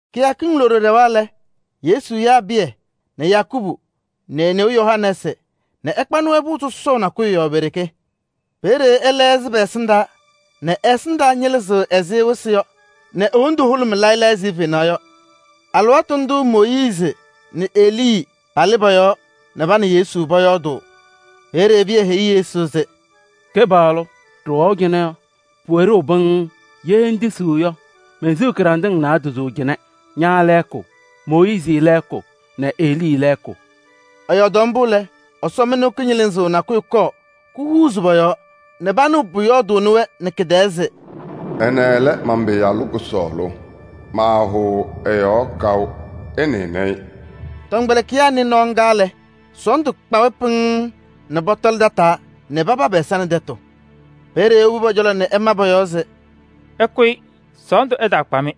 Kɩyakɩŋ loɖo ɖɛwa lɛ, Yesu yaa Pɩyɛ nɛ Yakubu nɛ e-neu Yohanɛɛsɩ nɛ ɛkpanɩ-wɛ pʋʋ sɔsɔʋ nakʋyʋ yɔɔ pe-ɖeke. Peeye ɛlɛɣzɩ pɛ-ɛsɩndaa nɛ ɛ-ɛsɩndaa ñɩlɩzɩɣ ɛzɩ wɩsɩ yɔ nɛ e-wondu hʋlʋmɩ layɩ layɩ ɛzɩ fenaɣ yɔ. Alɩwaatʋ ndʋʋ Mooyiizi nɛ Elii palɩ pɔ-yɔɔ nɛ pa nɛ Yesu pɔyɔɔdʋʋ. Peeye Pɩyɛ heyi Yesu se: “Kɩpaɣlʋ! Ɖɩwɛʋ cɩnɛ yɔ, pʋwɛ ɖeu pɩŋŋ. Ye ŋtisiɣ yɔ, mensiɣ kɩɖanɖɩŋ naadozo cɩnɛ: ña lɛɛkʋ, Mooyiizi lɛɛkʋ nɛ Elii lɛɛkʋ.” Ɛyɔɔdaɣ mbʋ lɛ, ɛsɔmɩnʋʋ kɩñɩlɩzʋʋ nakʋyʋ kɔɔ kuhuuzi pɔ-yɔɔ nɛ panɩɣ pʋyɔɔdʋʋnɩ-wɛ nɛ kɩ-tɛɛ se: “Ɛnɛ lɛ man-Pɩyalʋ kʋsɔɔlʋ, maahʋʋ ɛ-yɔɔ kaʋ. Ɩnɩnɩ-ɩ!” Tɔmkpɛlɩkɩyaa nɩ nɔɔ ŋga lɛ, sɔɔndʋ kpa-wɛ pɩŋŋ nɛ pɔtɔlɩ tataa nɛ papa pɛ-ɛza nɛ tɛtʋ. Peeye ewobi pɔ-cɔlɔ nɛ ɛma pɔ-yɔɔ se: “Ɩkʋyɩ, sɔɔndʋ ɛtaakpa-mɩ!”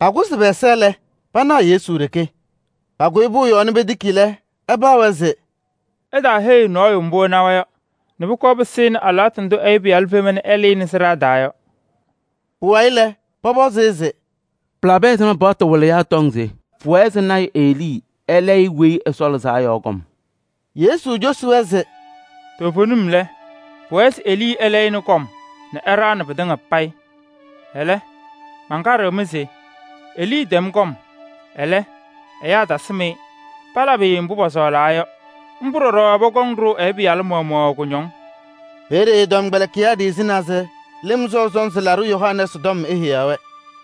Pakʋsɩ pɛ-ɛza lɛ, panaɣ Yesu ɖeke. Pakʋyɩ pʋʋ yɔɔ nɛ petiki lɛ, ɛpaɣ-wɛ se: “Ɩtaaheyi nɔɔyʋ mbʋ ɩnawa yɔ nɛ pʋkɔɔ pɩsɩnɩ alɩwaatʋ ndʋ Ɛyʋ Pɩyalʋ fema nɛ ɛlɩnɩ sɩɖaa taa yɔ.” Pʋwayɩ lɛ, pɔpɔzɩ-ɩ se: “Pɩlabɩ ɛzɩma paɣtʋ wɩlɩyaa tɔŋ se pʋwɛɛ se lɔɔyaɣ tʋ Elii ɛlayɩ Weyi Ɛsɔ Lɩzaa Yɔ kɔm?” Yesu cosi-wɛ se: “Toovenim lɛ, pʋwɛɛ se Elii ɛlɛyɩnɩ kɔm nɛ ɛɖaɣnɩ pɩtɩŋa payɩ. Ɛlɛ, mankaɖɩɣ-mɩ se: Elii tɛm kɔm, ɛlɛ, ɛyaa tasɩm-ɩ, palabɩ-ɩ mbʋ pɔsɔɔlaa yɔ. Mbʋ ɖɔɖɔ pɔkɔŋ ɖʋʋ Ɛyʋ Pɩyalʋ maɣmaɣ kʋñɔŋ.” Peeye ɛ-tɔmkpɛlɩkɩyaa ɖiɣzinaa se Lɩm Sɔʋ Sɔnzɩ Laɖʋ Yohanɛɛsɩ tɔm eheyaɣ-wɛ.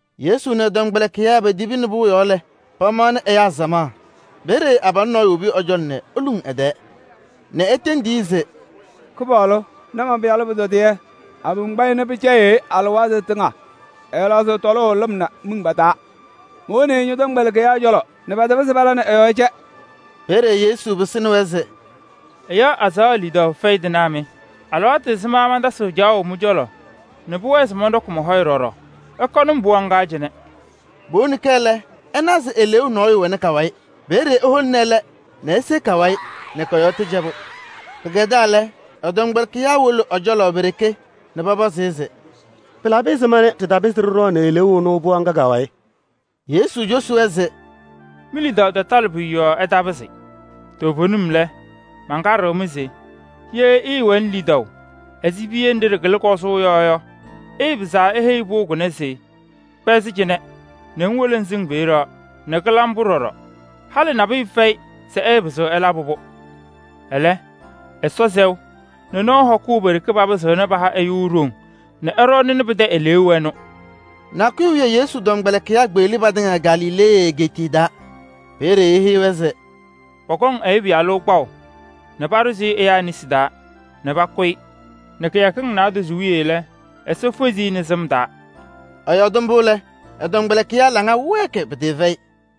Yesu nɛ ɛ-tɔmkpɛlɩkɩyaa petibini pʋʋ yɔɔ lɛ, pamaɣnɩ ɛyaa samaɣ. Peeye abalʋ nɔɔyʋ wobi ɛ-cɔlɔ nɛ eluŋ ɛ-tɛɛ nɛ etendi-i se: “Kɩpaɣlʋ! Na man-pɩyalʋ pʋtɔdɩyɛ. Abom kpa-ɩ nɛ pɩcɛyɩɣ-ɩ alɩwaatʋ tɩŋa. Ɛɛlaɣzɩɣ tɔlʋʋ lɩm nɛ miŋ pa-taa. Mowoni-i ñɔ-tɔmkpɛlɩkɩyaa cɔlɔ nɛ patapɩzɩ pala nɛ ɛ-yɔɔ cɛ.” Peeye Yesu pɩsɩnɩ-wɛ se: “Ɛyaa azaɣa lidaʋ fɛyɩ tɩnaa mɩ! Alɩwaatʋ ɛzɩma mantasɩɣ mɩ-cɔlɔ caɣʋ nɛ pʋwɛɛ se mɔnɖɔkɩ mɔ-hɔyɛ ɖɔɖɔ? Ɩkɔnɩ-m pɩɣa ŋga cɩnɛ!” Powoni-kɛ lɛ, ɛna se eleeu nɔɔyʋ wɛ ka-wayɩ. Peeye eholini ɛlɛ nɛ ese ka-wayɩ nɛ kɔ-yɔɔ tɩcɛbʋ. Pɩkɛdaa lɛ, ɛ-tɔmkpɛlɩkɩyaa wolo ɛ-cɔlɔ pe-ɖeke nɛ pɔpɔzɩ-ɩ se: “Pɩlabɩ ɛzɩma nɛ ɖɩtapɩzɩ ɖɩɖɔɔnɩ eleeu ɛnʋ pɩɣa ŋga ka-wayɩ?” Yesu cosi-wɛ se: “Mi-lidaʋ tatalɩ pʋyʋ yɔɔ ɩtapɩzɩ. Toovenim lɛ, mankaɖɩɣ-mɩ se: ye ɩɩwɛnɩ lidaʋ ɛzɩ piye nɖɩ ɖɩkɩlɩ kɔzʋʋ yɔ yɔ, ɩpɩzaɣ se iheyi pʋʋ kʋnɛ se: ‘Kpɛzɩ cɩnɛ nɛ ŋwolo ŋsɩŋ peeye yɔ!’ Nɛ kɩla mbʋ ɖɔɖɔ. Halɩ nabʋyʋ fɛyɩ se ɩɩpɩzɩɣ ɩlabɩ-pʋ. [ Ɛlɛ, Ɛsɔ sɛʋ nɛ nɔɔ hɔkʋʋ pe-ɖeke papɩzɩɣna paha ɛyʋ ɖoŋ nɛ ɛɖɔɔnɩnɩ pɩtɛ eleeu ɛnʋ.]” Nakʋyʋ wiye Yesu tɔmkpɛlɩkɩyaa kpeɣli patɩŋa Galilee egeetiye taa. Peeye eheyi-wɛ se: “Pɔkɔŋ Ɛyʋ Pɩyalʋ kpaʋ nɛ paɖʋzɩ ɛyaa nesi taa nɛ pakʋ-ɩ ɛsɩ nɛ kɩyakɩŋ naadozo wiye lɛ, Ɛsɔ fezi-i.” Ɛyɔɔdɩ mbʋ lɛ, ɛ-tɔmkpɛlɩkɩyaa laŋa wɛɛkɩ sɔsɔm pɩtɩɩfɛyɩ.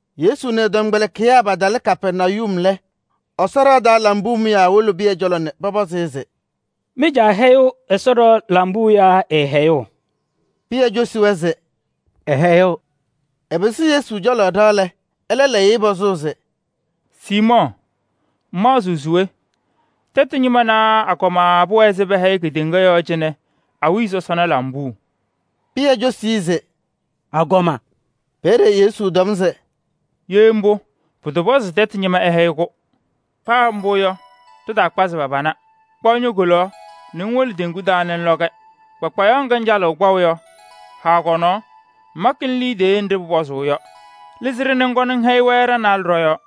Yesu nɛ ɛ-tɔmkpɛlɩkɩyaa patalɩ Kapɛrnayum lɛ, Ɛsɔ ɖɩɣa taa lambuu mʋyaa wolo Pɩyɛ cɔlɔ nɛ pɔpɔzɩ-ɩ se: “Mɩ-caa hɛyɩɣ Ɛsɔ ɖɩɣa lambuu yaa ɛɛhɛyɩɣ?” Pɩyɛ cosi-wɛ se: “Ɛhɛyɩɣ.” Ɛpɩsɩ Yesu cɔlɔ ɖɩɣa lɛ, ɛlɛ lɛyɩ-ɩ pɔzʋʋ se: “Siimɔɔ! Ŋmaɣzɩɣ se we? Tɛtʋ ñɩma naa agɔma pʋwɛɛ se pɛhɛyɩ kedeŋa yɔɔ cɩnɛ awiya sɔsɔna lambuu?” Pɩyɛ cosi-i se: “Agɔma.” Peeye Yesu tɔm se: “Ye mbʋ, pʋtɔpɔzɩ se tɛtʋ ñɩma ɛhɛyɩ-kʋ. Paa mbʋ yɔ, ɖɩtaakpazɩ pa-pana. Kpaɣ ño-kolaɣ nɛ ŋwolo teŋgu taa nɛ ŋlɔ-kɛ. Kpakpayaɣ ŋga ŋcalɩɣ kpaʋ yɔ, haa kɔ-nɔɔ, ŋmakɩnɩ liidiye nɖɩ pʋpɔzʋʋ yɔ. Lɩzɩ-ɖɩ nɛ ŋkɔnɩ ŋhɛyɩ-wɛ ɖa-naalɛ ɖɔ-yɔɔ.”